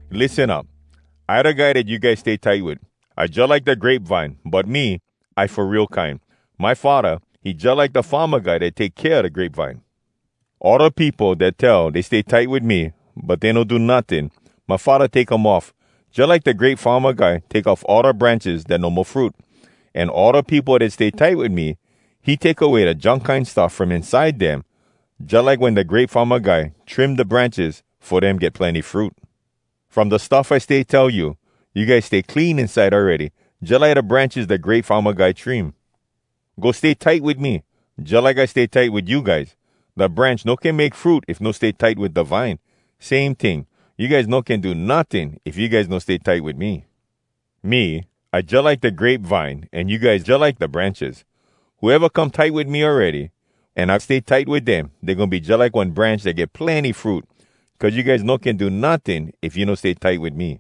“Lissen up. I da guy dat you guys stay tight wit. I jalike da grape vine, but me, I fo real kine. My Faddah, he jalike da farma guy dat take kea da grape vine. All da peopo dat tell dey stay tight wit me, but dey no do notting, my Faddah take um off, jalike da grape farma guy take off all da branches dat no mo fruit. An all da peopo dat stay tight wit me, he take away da junk kine stuff from inside dem, jalike wen da grape farma guy trim da branches fo dem get plenny fruit. “From da stuff I stay tell you, you guys stay clean inside awready, jalike da branches da grape farma guy trim. Go stay tight wit me, jalike I stay tight wit you guys. Da branch no can make fruit if no stay tight wit da vine. Same ting, you guys no can do notting if you guys no stay tight wit me. “Me, I jalike da grape vine, an you guys jalike da branches. Whoeva come tight wit me awready, an I stay tight wit dem, dey goin be jalike one branch dat get plenny fruit. Cuz you guys no can do notting if you no stay tight wit me.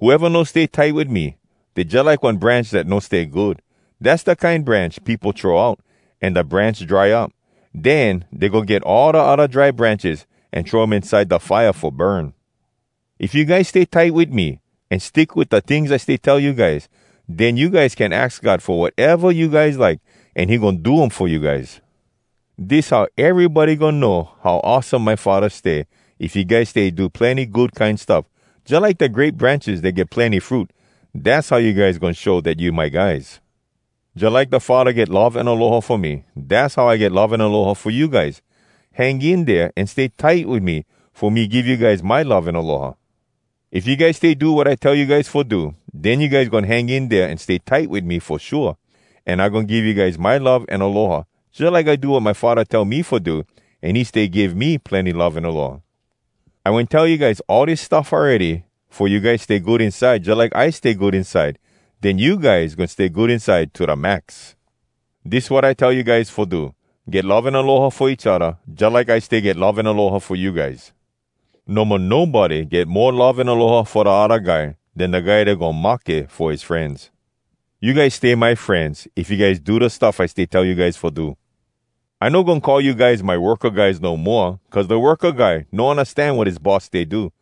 Whoeva no stay tight wit me, dey jalike one branch dat no stay good. Dass da kine branch peopo throw out, an da branch dry up. Den dey go get all da odda dry branches, an throw um inside da fire fo burn. If you guys stay tight wit me, an stick wit da tings I stay tell you guys, den you guys can aks God fo wateva you guys like, an he goin do um fo you guys. “Dis how erybody goin know how awesome my Faddah stay, if you guys stay do plenny good kine stuff, jalike da grape branches dat give plenny fruit. Dass how you guys goin show dat you my guys. “Jalike da Faddah get love an aloha fo me, dass how I get love an aloha fo you guys. Hang in dea an stay tight wit me, fo me give you guys my love an aloha. If you guys stay do wat I tell you guys fo do, den you guys goin hang in dea an stay tight wit me fo shua, an I goin give you guys my love an aloha. Jalike I do wat my Faddah tell me fo do, an he stay give me plenny love an aloha. “I wen tell you guys all dis stuff awready fo you guys stay good inside, jalike I stay good inside. Den you guys goin stay good inside to da max. Dis wat I tell you guys fo do: Get love an aloha fo each odda, jalike I stay get love an aloha fo you guys. No mo nobody get mo love an aloha fo da odda guy, den da guy dat goin mahke fo his frenz. You guys stay my frenz, if you guys do da stuff I stay tell you guys fo do. I no goin call you guys my worka guys no moa, cuz da worka guy no undastan wat his boss stay do.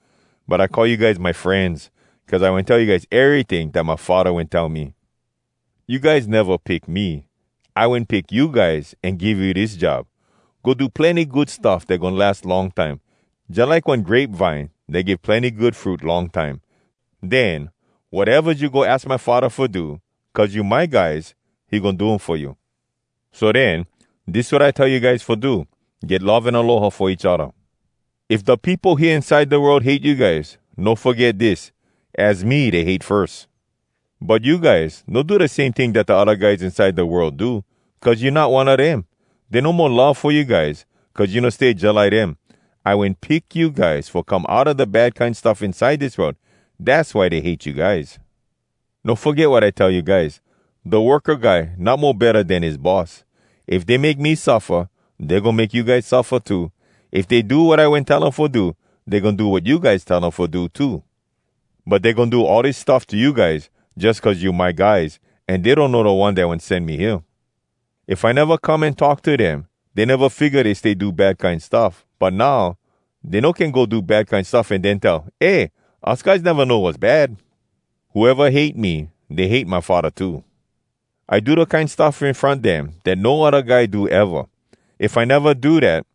But I call you guys my frenz, cuz I wen tell you guys eryting dat my Faddah wen tell me. You guys neva pick me. I wen pick you guys, an give you dis job: go do plenny good stuff dat goin las long time, jalike one grape vine dat give plenny good fruit long time. Den, watevas you go aks my Faddah fo do cuz you my guys, he goin do um fo you. So den, dis wat I tell you guys fo do: get love an aloha fo each odda. “If da peopo hea inside da world hate you guys, no foget dis: az me dey hate firs. But you guys no do da same ting dat da odda guys inside da world do, cuz you not one a dem. Dey no mo love fo you guys, cuz you no stay jalike dem. I wen pick you guys fo come outa da bad kine stuff inside dis world. Dass why dey hate you guys. “No foget wat I tell you guys. Da worka guy not mo betta den his boss. If dey make me suffa, dey goin make you guys suffa too. If dey do wat I wen tell um fo do, dey goin do wat you guys tell um fo do too. But dey goin do all dis stuff to you guys, jus cuz you my guys, an dey donno da One dat wen sen me hea. If I neva come an talk to dem, dey neva figga dey stay do bad kine stuff. But now, dey no can go do bad kine stuff an den tell, ‘Eh, us guys neva know was bad!’ Whoeva hate me, dey hate my Faddah too. I do da kine stuff in front dem dat no odda guy do eva. If I neva do dat,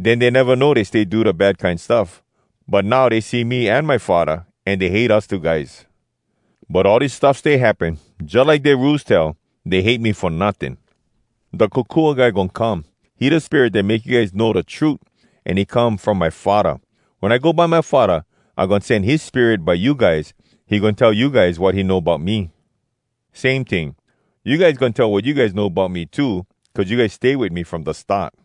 den dey neva know dey stay do da bad kine stuff. But now dey see me an my Faddah, an dey hate us two guys. But all dis stuff stay happen, jalike dea Rules tell, ‘Dey hate me fo notting.’ “Da Kokua Guy goin come. He da Spirit dat make you guys know da trut, an he come from my Faddah. Wen I go by my Faddah, I goin sen his Spirit by you guys. He goin tell you guys wat he know bout me. Same ting, you guys goin tell wat you know bout me too, cuz you guys stay wit me from da start.”